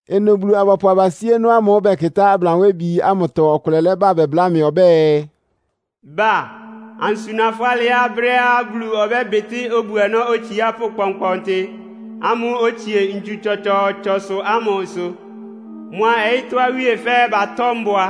Ɩnʋ Bulu-abɔpʋ abasíénɔ́ ámʋ́ʋ́ bɛkɩtá ablanwébi ámʋtɔ ɔkʋlɛ lɛ́ba bɛbláa mɩ ɔbɛ́ɛ, “Ba, ansuna fʋ́ alɩá brɛ́á Bulu ɔbɛ́bɩtɩ́ obu-ɔnɔ́ otsiápʋ́ kpɔnkpɔntɩ ámʋ́ʋ́ otsie ntsu tsɔtsɔɔtsɔsʋ ámʋ ɩsʋ. Mʋa ɔyɩ́tɔ́ awíe fɛ́ɛ́ batɔ́ mbʋa.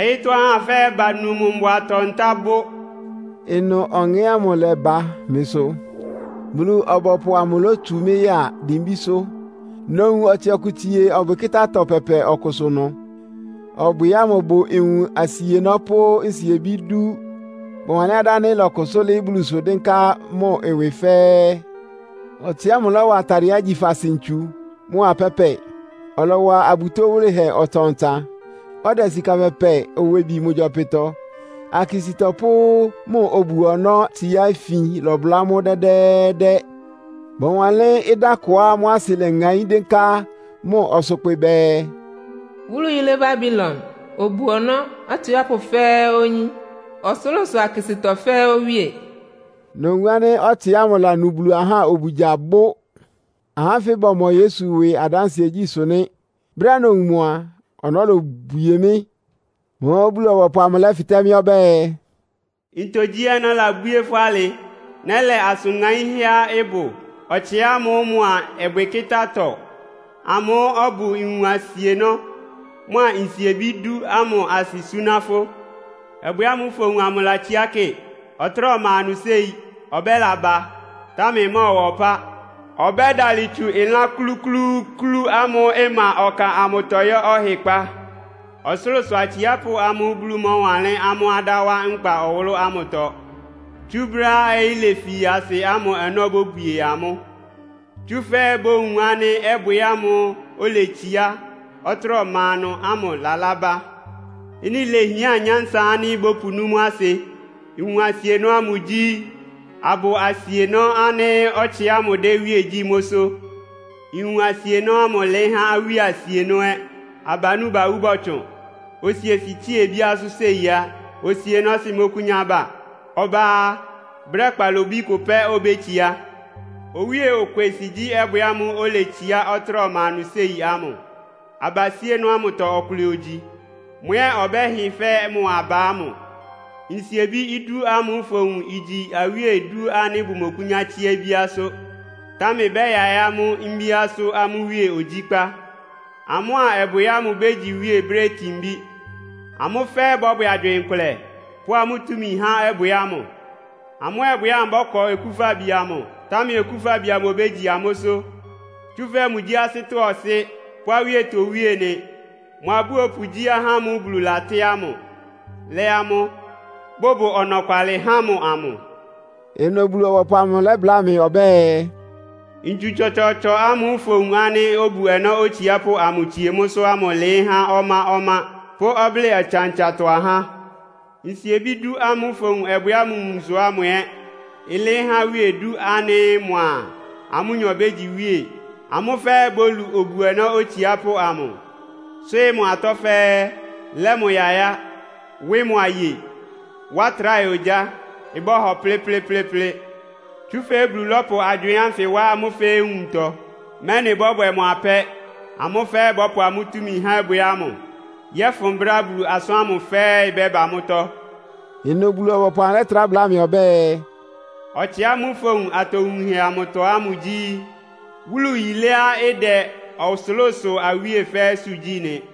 Ɔyɩ́tɔ́ ahá fɛ́ɛ́ banu mʋ mbʋatɔ-ntá bʋ́.” Ɩnʋ Ɔŋɛ́ ámʋ lɛ́ba mɩsʋ, Bulu-ɔbɔpʋ amʋ lótsu mɩ́ ya dimbísʋ́. Nowun ɔtsɩ ɔkʋ tsie ɔbwɩkɩ́tá-atɔ pɛpɛ ɔkʋsʋ ɩnʋ. Ɔbwɩ ámʋ bʋ nwun asienɔ́ pʋ́ nsiebí idú. Bɔwanlɩ́n adá ánɩ́ ɩlɔkʋsʋ́ lɩ́ɩ́ Bulusʋ dɩ́nká mʋ ɩwɩ fɛ́ɛ́. Ɔtsɩ ámʋ lɔ́wa atadɩɛá igyi faasɩ ntsu mʋ́a pɛ́pɛ. Ɔlɔwa abutó wʋlɩhɛ ɔtsan-ɔtsan, ɔdɛ sika pɛpɛ owebi mʋ gyɔpɩtɔ. Akisítɔ pʋ́ mʋ obu-ɔnɔ́tsiá ifin lɔbʋlá mʋ́ dɛ́dɛ́ɛ́dɛ́. Bɔwanlɩ́n ɩdá kʋá mʋ́ asɩ leŋaín dɩ́nká mʋ ɔsʋkpɩ bɛɛ, “Wúlu yílé Babilon, obu-ɔnɔ́ atsiápʋ́ fɛ́ɛ́ oyín. Ɔsʋlʋ́sʋ akisítɔ fɛ́ɛ́ owíe.” Nowun ánɩ́ ɔtsɩ ámʋ lanu Bulu ahá obugya bʋ́. Ahá ánfɩ bɔmɔ Yesu ɩwɩ adánsɩɛgyí sʋ nɩ́. Brɛ́á nowun mʋ a, ɔnɔ́ lobwie mɩ́. Mʋ́ʋ́ Bulu-ɔbɔpʋ amʋ lɛ́fɩtɛ́ mɩ́ ɔbɛ́ɛ, “Ntogyi ɔnɔ́ labwíé fʋ́ alɩ? Nɛ́lɛ asʋn ŋaínhɛ́á ɩbʋ ɔtsɩ ámʋ mʋa ɔbwɩkɩ́tá-atɔ amʋ́ʋ́ ɔbʋ nwun asienɔ́ mʋ́a nsiebí dú ámʋ asɩ súná fʋ́. Ɔbwɩ ámʋ́ʋ́ fowun amʋ latsíá kɩ. Ɔtráa ɔma ɩnʋ séi, ɔbɛ́laba. Támɛ ɩmɔ́ɔwa ɔpá ɔbɛ́dalɩ tsu ɩlán klúklúúklú ámʋ́ʋ́ ɩma ɔka ámʋtɔ yɔ́ ɔhɩkpá. Ɔsʋlʋ́sʋ atsiápʋ́ amʋ́ʋ́ Bulu mɔ́wanlɩ́n amʋ́ adá wá nkpa ɔwʋlʋ́ ámʋtɔ tsú brɛ́á ɔyɩ́ lefi asɩ ámʋ ɔnɔ́ bóbwie amʋ́, tsúfɛ́ bowun ánɩ́ ɔbwɩ ámʋ́ʋ́ oletsiá, ɔtráa ɔma ɩnʋ ámʋ lalá bá. “Ɩ́nɩ léhián nyánsa ánɩ́ bɔ́pʋnú mʋ́ asɩ. Nwun asienɔ́ ámʋ igyi abʋ asienɔ́ ánɩ́ ɔtsɩ ámʋ dɛ́ iwíe gyí mʋ́sʋ́. Nwun asienɔ́ ámʋ ɩlɩɩ́ há awíe asienɔ́ ɛ́. Abanú bawú bɔtsʋn, osiesɩ tsíe obíásʋ́ séi á. Osienɔ́sɩ́ mɔ́kʋ́nyá ba. Ɔbá á, brɛ́ kpalobí kʋ pɛ́ obétsiá. Owíe okwesɩ gyí ɔbwɩ ámʋ́ʋ́ oletsiá, ɔtráa ɔma ɩnʋ séi ámʋ. Abasíénɔ́ ámʋtɔ ɔkʋlɛ ogyi. Mʋ ɛ́ ɔbɛ́hɩ fɛ́ mʋ aba ámʋ. “Nsiebí dú ámʋ́ʋ́ fowun amʋ igyi awíe idú ánɩ́ bʋmɔkʋ́nyá tsíá obíásʋ́. Támɛ bɛ́yaɩ́ amʋ́ mbíásʋ́ amʋ́ iwíe ogyíkpá. Amʋ́a ɔbwɩ ámʋ bégyi iwíe brɛ́ itinbí. Amʋ́ fɛ́ɛ́ bɔ́bwɛ agywɩɩn kʋlɛ, pʋ́ amʋ́ túmi há ɔbwɩ ámʋ. Amʋ́a ɔbwɩ ámʋ bɔ́kɔ Okúfabi amʋ, támɛ Okúfabi amʋ obégyi amʋ́sʋ́, tsúfɛ́ mʋgyí asɩ́tɔ́ Ɔsɩ́ pʋ́ awíetɔ Owíe nɩ. Mʋ abúopʋ gyí ahá ámʋ́ʋ́ Bulu latɩ́ amʋ́, lɛ́ amʋ́, bʋbʋ ɔnɔkwalɩ há mʋ amʋ.” Ɩnʋ Bulu-ɔbɔpʋ amʋ lɛ́bláa mɩ ɔbɛ́ɛ, “Ntsu tsɔtsɔɔtsɔ ámʋ́ʋ́ fowun ánɩ́ obu-ɔnɔ́ otsiápʋ́ ámʋ tsie mʋ́sʋ́ ámʋ ɩlɩɩ́ há ɔmá-ɔmá pʋ́ ɔblɩ́ɩ ɔtsan-ɔtsantɔ ahá. Nsiebí dú ámʋ́ʋ́ fowun ɔbwɩ ámʋ nwunsʋ ámʋ ɛ́ ɩlɩɩ́ há awíe idú ánɩ́ mʋa amʋ́nyɔ bégyi iwíe. Amʋ́ fɛ́ɛ́ bólu obu-ɔnɔ́ otsiápʋ́ ámʋ, swɩ́ɩ́ mʋ atɔ́ fɛ́ɛ́, lɛ́ mʋ yayá, wɩ́ mʋ aye, wá tráhɛ ogyá, ɩbɔ́hɔ plɩ́plɩ́plɩ́plɩ́. Tsúfɛ́ Bulu lɔ́pʋ agywɩɩn ánfɩ wá amʋ́ fɛ́ɛ́ nwuntɔ, mɛ́nɩ bɔ́bwɛ mʋ apɛ́. Amʋ́ fɛ́ɛ́ bɔ́pʋ amʋ́ túmi há ɔbwɩ ámʋ, yɔ́fʋn brɛ́á Bulu asʋ́n ámʋ fɛ́ɛ́ ɩbɛ́ba mʋ́tɔ́.” Ɩnʋ Bulu-ɔbɔpʋ amʋ lɛ́trá bláa mɩ ɔbɛ́ɛ, “Ɔtsɩ ámʋ́ʋ́ fowun atowunhɛ amʋtɔ ámʋ gyí wúlu yíléá ɩdɛ ɔsʋlʋ́sʋ awíe fɛ́ɛ́sʋ́ gyí nɩ.”